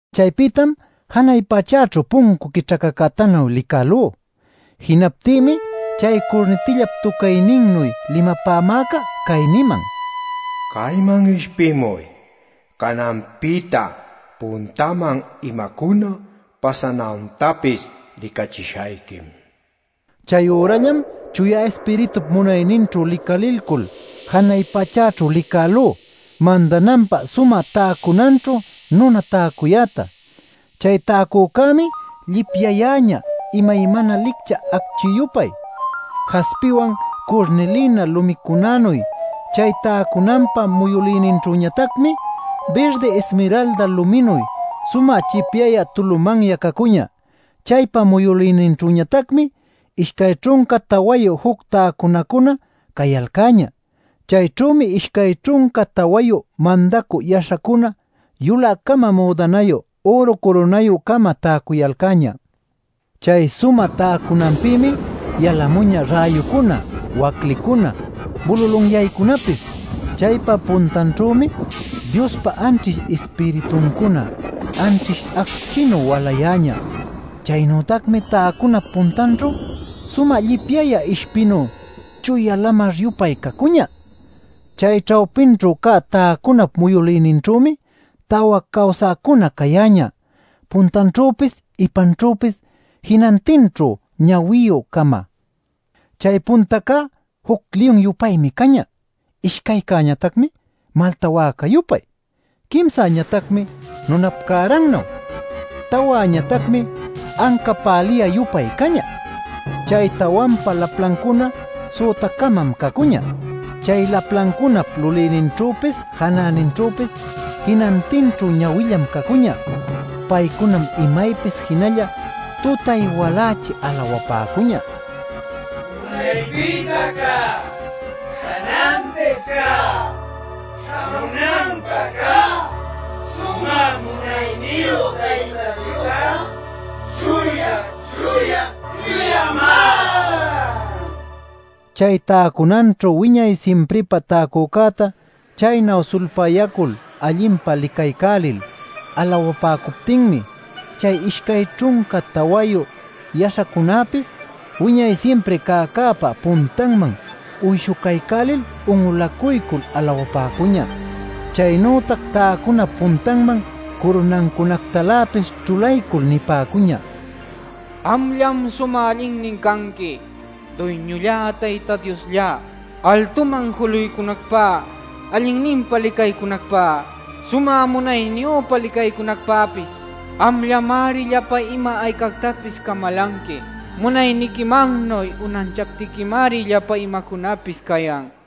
Chaypïtam janay pachäćhu puncu quićhacacütanuy licälú. Jinaptïmi chay curnitillap tucayninnuy limapämäca cay niman: “Cayman ishpimuy. Cananpïta puntaman imacuna pasanantapis licachishayquim” nil. Chayürallam Chuya Ispiritup munayninćhu licalilcul janay pachäćhu licälú mandananpä sumä täcunanćhu nuna täcuyäta. Chay täcücämi llipyayäñä imaymana licchä acchi-yupay, jaspiwan curnilina lumicunänuy. Chay täcunanpa muyülïninćhüñatacmi birdi ismiralda luminuy sumä chipyayä tulumanya cacuñä. Chaypa muyülïninćhüñatacmi ishcay ćhunca tawayu juc täcunacuna cayalcäñä. Chayćhümi ishcay ćhunca tawayu mandacü yaśhacuna yulä-cama müdanayu üru curunayü-cama täcuyalcäñä. Chay sumä täcunanpïmi yalamuñä räyucuna, waclicuna, bululunyaycunapis. Chaypa puntanćhümi Diospa anćhish Ispirituncuna anćhish acchinuy walayäñä. Chaynütacmi täcunap puntanćhu sumä llipyayä ishpinuy chuya lamar-yupay cacuñä. Chay ćhawpićhu cä täcunap muyülïninćhümi tawa cawsäcuna cayäñä puntanćhüpis ipanćhüpis jinantinćhu ñawiyü-cama. Chay puntacá juc liyun-yupaymi cañä. Ishcaycäñatacmi malta wäca-yupay; quimsäñatacmi nunap cärannuy; tawäñatacmi anca päliyä-yupay cañä. Chay tawanpa laplancuna süta-camam cacuñä. Chay laplancunap lulïninćhüpis janäninćhüpis jinantinćhu ñawillam cacuñä. Paycunam imaypis jinalla tutay-walächi alawapäcuñä: “¡Unaypïta cä, cananpis cä, śhamunanpä cä Sumä Munayniyu Tayta Dios'a chuya, chuya, chuyamá!” nil. Chay täcunanćhu wiñay simpripä täcücäta chaynu sulpayacul allinpa licaycälil alawapäcuptinmi chay ishcay ćhunca tawayu yaśhacunäpis wiñay simpri cäcäpa puntanman uyshucaycälil un'ulacuycul alawapäcuñä. Chaynütac täcunap puntanman curunancunactaläpis ćhulaycul nipäcuñä: “Amllam sumä allinnin canqui, Duyñullá, Tayta Diosllá, altuman juluycunacpä, allinninpa licaycunacpä, sumä munayniyüpa licaycunacpäpis. Amllamari llapa ima-aycactapis camalanqui. Munayniquimannuy unanchaptiquimari llapa imacunapis cayan” nil.